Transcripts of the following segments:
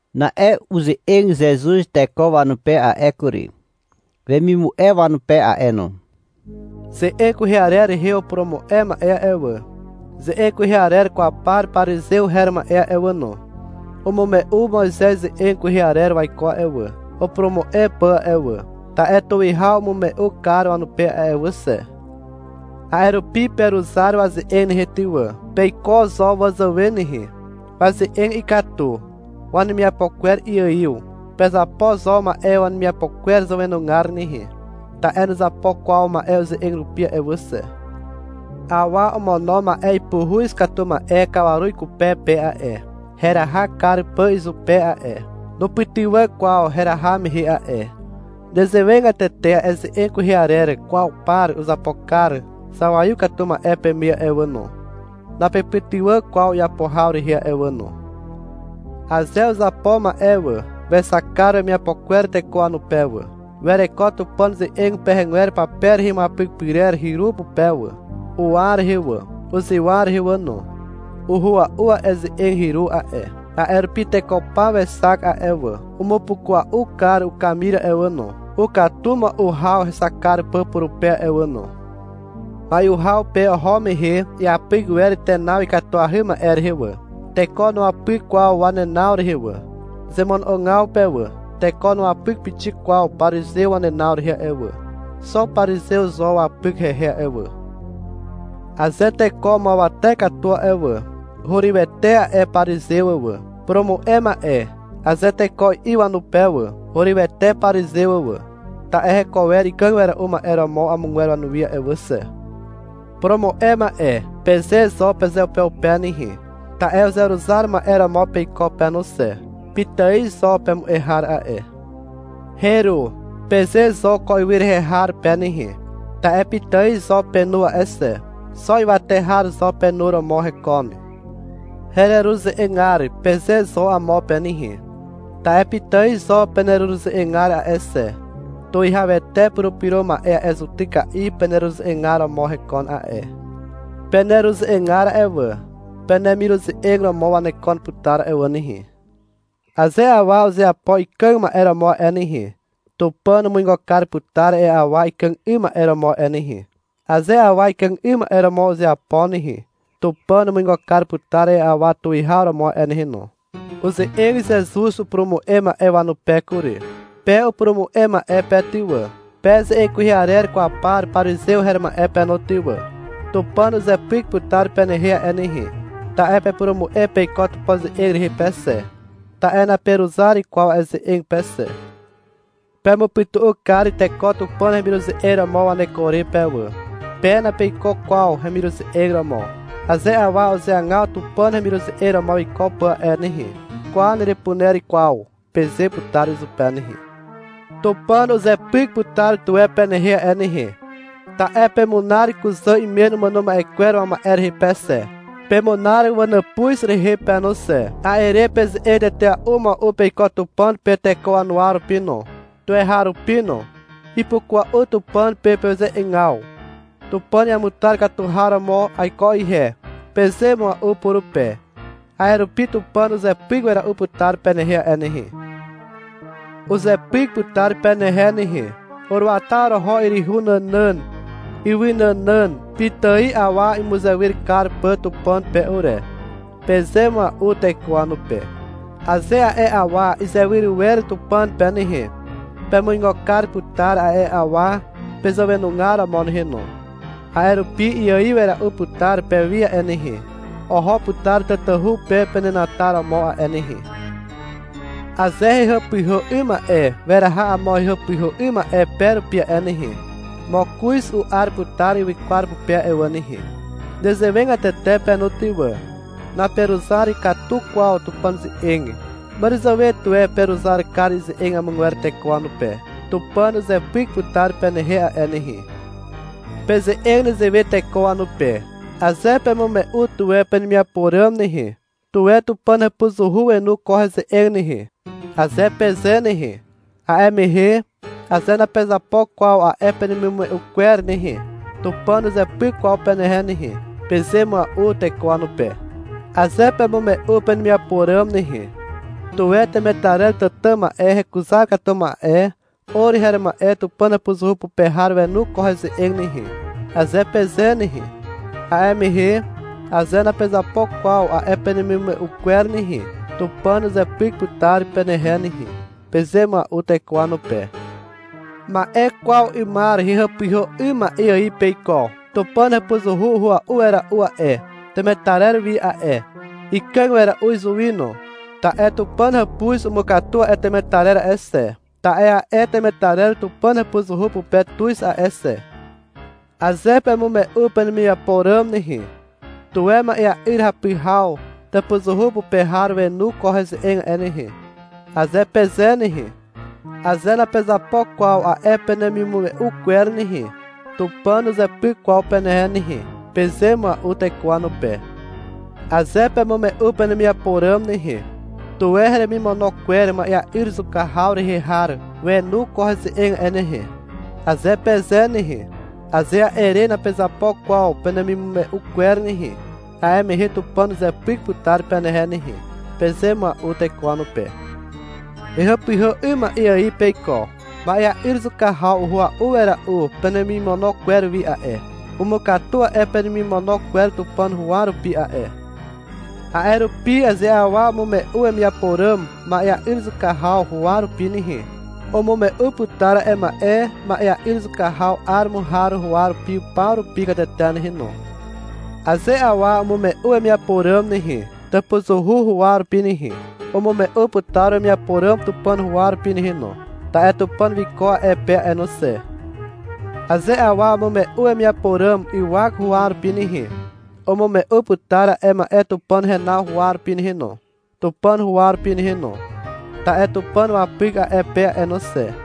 Na'e uze'eg Zezuz teko wanupe a'e kury, wemimu'e wanupe a'e no. — Ze'eg kwehe arer rehe upurumu'e ma'e a'e wà, ze'eg kwehe arer kwaw par parizew her ma'e a'e wà no, umume'u Moizez ze'eg kwehe arer waiko a'e wà, upurumu'e pà a'e wà, ta'e tuwihaw umume'u kar wanupe a'e wà xe. A'e rupi peruzar waze'eg nehe ty wà. Peiko zo wazàwe nehe. (Waze'eg ikatu. Wanemiapo kwer iaiw.) Pezapo zo ma'e wanemiapo kwer zàwenugar nehe, ta'e nuzapo kwaw ma'e uze'eg rupi a'e wà xe. Awa omono ma'e ipuhuz katu ma'e kawaru ikupe pe a'e, heraha kar pà izupe a'e. Nupytywà kwaw heraha mehe a'e. Nezewegatete a'e ze'eg kwehe arer kwaw par uzapo kar zawaiw katu ma'e peme a'e wà no. Napepytywà kwaw iapo haw rehe a'e wà no. Aze uzapo ma'e wà, wexak kar wemiapo kwer teko wanupe wà. Wereko Tupàn ze'eg pehegwer pape rehe imuapyk pyrer hyru pupe wà, uwa rehe wà, uzywa rehe wà no. Uhua'u a'e ze'eg hyru a'e. A'e rupi teko paw wexak a'e wà. Umupukua'u kar ukamir a'e wà no, ukatu mua'u haw hexak kar pà purupe a'e wà no. Mai'u haw pe oho mehe iapyk wer tenaw ikatuahy ma'e rehe wà. Teko nuapyk kwaw wanenaw rehe wà, zemono'ogaw pe wà. Teko nuapyk pixik kwaw parizew wanenaw rehe a'e wà. Xo parizew zo wapyk hehe a'e wà. Aze teko umuawate katu a'e wà, hurywete a'e parizew wà. — Purumu'e ma'e, aze teko i'i wanupe wà, hurywete parizew wà. Ta'e heko wer ikàg wera'u ma'e romo amogwer wanuwi a'e wà xe. — Purumu'e ma'e, peze zo pezeupeupe nehe. Ta'e uzeruzar ma'e romo peiko pe no xe. Pitài zo pemu'e har a'e. — Heru, peze zo ko ywy rehe har pe nehe, ta'e pitài zo penu a'e xe. Xo ywate har zo penu romo hekon. — Hereruze'egar, peze zo amo pe nehe, ta'e pitài zo peneruze'egar a'e xe. Tuwihawete Purupyro Ma'e a'e zutyka'i peneruze'egar romo hekon a'e. Peneruze'egar a'e wà, penemiruze'eg romo wanekon putar a'e wà nehe. Aze awa uzeapo ikàg ma'e romo a'e nehe, Tupàn umuigo kar putar a'e awa ikàg 'ym ma'e romo a'e nehe. Aze awa ikàg 'ym ma'e romo uzeapo nehe, Tupàn umuigo kar putar a'e awa tuwihaw romo a'e nehe no. Uze'eg Zezuz upurumu'e ma'e wanupe kury. — Pe upurumu'e ma'e pe ty wà, pe ze'eg kwehe arer kwaw par parizew her ma'e pe no ty wà, Tupàn uzepyk putar penehe a'e nehe, ta'e pepurumu'e peiko Tupàn ze'eg rehe pe xe, ta'e naperuzar kwaw a'e ze'eg pe xe. Pemupytu'u kar teko Tupàn hemiruze'eg romo waneko re pe wà. Pe napeiko kwaw hemiruze'eg romo. Aze awa uzeagaw Tupàn hemiruze'eg romo wiko pà a'e nehe, — Kwa, nerepuner kwaw, peze putar izupe nehe. Tupàn uzepyk putar tuwe penehe a'e nehe. Ta'e pemunar kuzà imen umàno ma'e kwer wama'e rehe pe xe, pemunar wanàpuz rehe pe no xe. A'e re peze'eg tetea'u mua'u peiko Tupàn pe teko wanuwa rupi no, tuweharupi no. Ipukua'u Tupàn pe peze'egaw. — Tupàn iamutar katu har romo aiko ihe, peze mua'u purupe. A'e rupi Tupàn uzepyk wera'u putar penehe a'e nehe. Uzepyk putar penehe nehe. — Uruata oroho yryhu nànàn ywy nànàn pitài awa imuzewyr kar pà Tupàn pe ure, peze mua'u teko wanupe. Aze a'e awa izewyr wer Tupàn pe nehe, pemuigo kar putar a'e awa pezàwenugar romo nehe no. A'e rupi iaiw wera'u putar pewi a'e nehe, oho putar tatahu pe penenataromo a'e nehe. Aze hehàpyhà 'ym ma'e weraha amo hehàpyhà 'ym ma'e pe rupi a'e nehe, mokoz u'ar putar ywykwar pupe a'e wà nehe. Nezewegatete pe no ty wà. Naperuzar katu kwaw Tupàn ze'eg. Màràzàwe tuwe peruzar kar ize'eg amogwer teko wanupe. Tupàn uzepyk putar penehe a'e nehe. Peze'eg nezewe teko wanupe. — Aze pemume'u tuwe penemiapo ràm nehe, — Tuwe Tupàn hàpuzuhu wenu ko heze'eg nehe, aze peze nehe, a'e mehe aze napezapo kwaw a'e penemimume'u kwer nehe, Tupàn nuzepyk kwaw penehe nehe, peze mua'u teko wanupe. — Aze pemume'u penemiapo ràm nehe, — Tuwe temetarer tàtà ma'e hekuzar katu ma'e or her ma'e Tupàn hàpuzuhu pupe har wenu ko heze'eg nehe, aze peze nehe, a'e mehe aze napezapo kwaw a'e penemimume'u kwer nehe, Tupàn uzepyk putar penehe nehe, peze mua'u teko wanupe. Ma'e kwaw 'ymar hehàpyhà 'ym ma'e ài peiko. Tupàn hàpuzuhu uhua'u wera'u a'e temetarer wi a'e. Ikàg wera'u izuwi no. Ta'e Tupàn hàpuz umukatu a'e temetarer a'e xe. Ta'e a'e temetarer Tupàn hàpuzuhu pupe tuz a'e xe. — Aze pemume'u penemiapo ràm nehe, — Tuwe ma'ea'yr hapy haw tàpuzuhu pupe har wenu ko heze'eg a'e nehe, aze peze nehe, aze napezapo kwaw a'e penemimume'u kwer nehe, Tupàn nuzepyk kwaw penehe nehe, peze mua'u teko wanupe. — Aze pemume'u penemiapo ràm nehe, — Tuwe heremimono kwer ma'ea'yr zuka haw rehe har wenu ko heze'eg a'e nehe, aze peze nehe, aze a'e re napezapo kwaw penemimume'u kwer nehe, a'e mehe Tupàn uzepyk putar penehe nehe, peze mua'u teko wanupe. Hehàpyhà 'ym ma'e ài peiko. Ma'ea'yr zuka haw uhua'u wera'u penemimono kwer wi a'e. Umukatu a'e penemimono kwer Tupàn huwa rupi a'e. A'e rupi aze awa umume'u wemiapo ràm ma'ea'yr zuka haw huwa rupi nehe, umume'u putar a'e ma'e ma'ea'yr zuka haw 'aromo har huwa rupi paw rupi katete nehe no. Aze awa umume'u wemiapo ràm nehe, tàpuzuhu huwa rupi nehe, umume'u putar wemiapo ràm Tupàn huwa rupi nehe no, ta'e Tupàn wiko a'e pe a'e no xe. Aze awa umume'u wemiapo ràm ywak huwa rupi nehe, umume'u putar a'e ma'e Tupàn henaw huwa rupi nehe no, Tupàn huwa rupi nehe no, ta'e Tupàn wapyk a'e pe a'e no xe.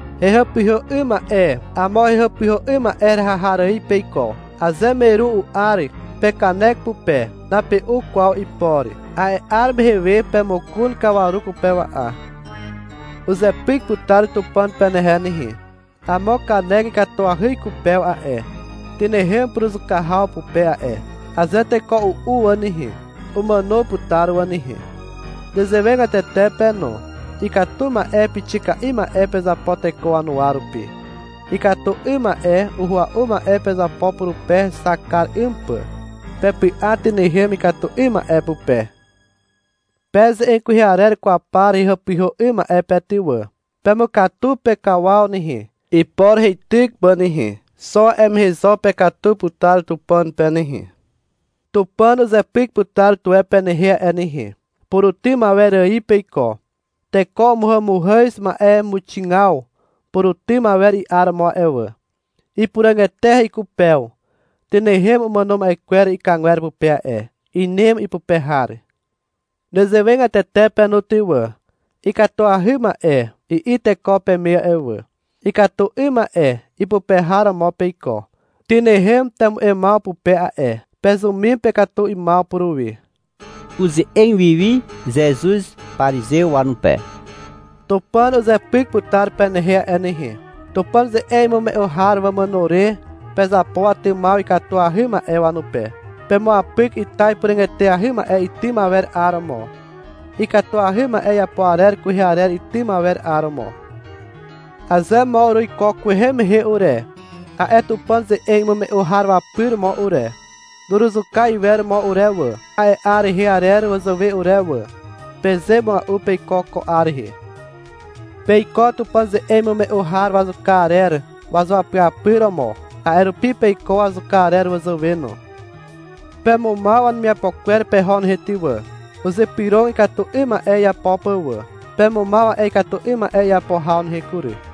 Hehàpyhà 'ym ma'e amo hehàpyhà 'ym ma'e heraha har ài peiko. Aze meru u'ar pekanek pupe, nape'u kwaw ipor. A'e 'ar mehe we pemokon kawaru kupewa'a. Uzepyk putar Tupàn penehe nehe. Amo kanek ikatuahy ikupew a'e. Tynehem puruzuka haw pupe a'e. Aze teko u'u wà nehe, umàno putar wà nehe. Nezewegatete pe no. Ikatu ma'e pixika'i ma'e pezapo teko wanuwa rupi. Ikatu 'ym ma'e uhua'u ma'e pezapo purupe hexak kar 'ym pà. Pepy'a tynehem ikatu 'ym ma'e pupe. Pe ze'eg kwehe arer kwaw par hehàpyhà 'ym ma'e pe ty wà. Pemukatu pekawaw nehe, ipor heityk pà nehe, xo a'e mehe zo pekatu putar Tupàn pe nehe. Tupàn uzepyk putar tuwe penehe a'e nehe. Purutym awer ài peiko. Teko umuhàmuhàz ma'emuxigaw purutym awer i'aromo a'e wà. Ipuràg eteahy ikupew. Tynehem umàno ma'e kwer ikàgwer pupe a'e. Inem ipupe har. Nezewegatete pe no ty wà. — Ikatuahy ma'e, i'i teko peme a'e wà. Ikatu 'ym ma'e ipupe har romo peiko. Tynehem temu'emaw pupe a'e. Pezumim pekatu 'ymaw puruwi. (Uze'eg wiwi Zezuz parizew wanupe.) — Tupàn uzepyk putar penehe a'e nehe. Tupàn ze'eg imume'u har wamàno re pezapo watymaw ikatuahy ma'e wanupe. Pemuapyk ita ipuràg eteahy ma'e itym awer 'aromo, ikatuahy ma'e iapo arer kwehe arer itym awer 'aromo. — Aze mo uruiko kwehe mehe ure, a'e Tupàn ze'eg imume'u har wapyr mo ure, nuruzuka iwer mo ure wà, a'e 'ar rehe arer wazàwe ure wà, peze mua'u peiko ko 'ar rehe. Peiko Tupàn ze'eg imume'u har wazuka arer wazuapyapyr romo. A'e rupi peiko wazuka arer wazàwe no. Pemumaw wanemiapo kwer peho nehe ty wà. Uzypyrog ikatu 'ym ma'e iapo pà wà. Pemumaw a'e ikatu 'ym ma'e iapo haw nehe kury.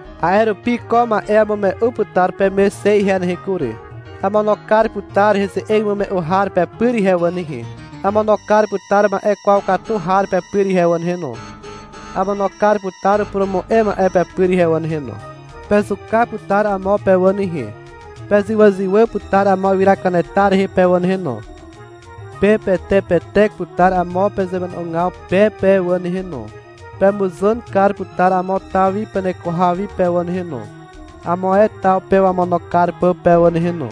A'e rupi ko ma'e amume'u putar peme xe ihe nehe kury. Amono kar putar heze'eg imume'u har pepyr ihe wà nehe, amono kar putar ma'e kwaw katu har pepyr ihe wà nehe no, amono kar putar upurumu'e ma'e pepyr ihe wà nehe no. Pezuka putar amo pe wà nehe. Pezywàzywà putar amo ywyra kanetar rehe pe wà nehe no, pepetepetek putar amo pezemono'ogaw pe pe wà nehe no. Pemuzàn kar putar amo taw wi peneko haw wi pe wà nehe no, amo ae taw pe wamono kar pà pe wà nehe no.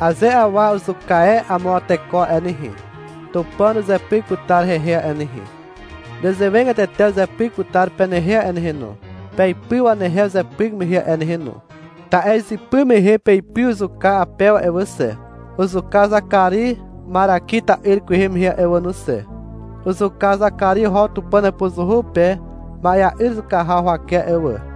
Aze awa uzuka e amo teko a'e nehe, Tupàn uzepyk putar hehe a'e nehe. Nezewegatete uzepyk putar penehe a'e nehe no, peipy wanehe uzepyk mehe a'e nehe no, ta'e izypy mehe peipy uzuka Apew a'e wà xe, uzuka Zakari Maraki ta'yr kwehe mehe a'e wà no xe. Uzuka Zakari oho Tupàn hàpuzuhu pe ma'ea'yr zuka haw huwake a'e wà.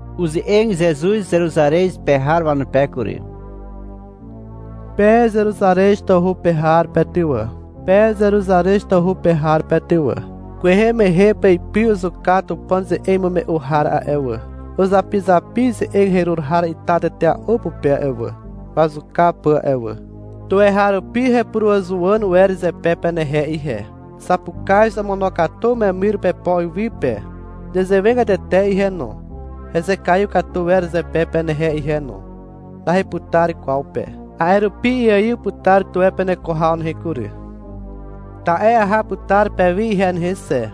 Uze'eg Zezuz Zeruzarez pe har wanupe kury. — Pe Zeruzarez tawhu pe har pe ty wà, pe Zeruzarez tawhu pe har pe ty wà, kwehe mehe peipy uzuka Tupàn ze'eg imume'u har a'e wà, uzapizapi ize'eg herur har ita tetea'u pupe a'e wà, wazuka pà a'e wà. Tuweharupi hepuruàzuwàn wer zepe penehe ihe. Zapukaz omono'ogatu umemyr upepo iwy pe. Nezewegatete ihe no. Hezekaiw katu wer zepe penehe ihe no. Naheputar kwaw pe. A'e rupi iaiw putar tuwe peneko haw nehe kury. Ta'e aha putar pewi ihe nehe xe.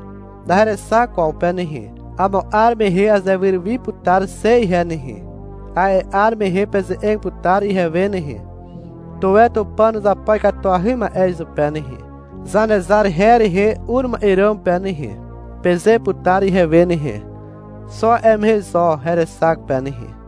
Naherexak kwaw pe nehe. Amo 'ar mehe azewyr wi putar xe ihe nehe. A'e 'ar mehe peze'eg putar ihewe nehe. — Tuwe Tupàn uzapo ikatuahy ma'e izupe nehe, Zanezar her rehe ur ma'e ràm pe nehe, peze putar ihewe nehe. Xo a'e mehe zo herexak pe nehe.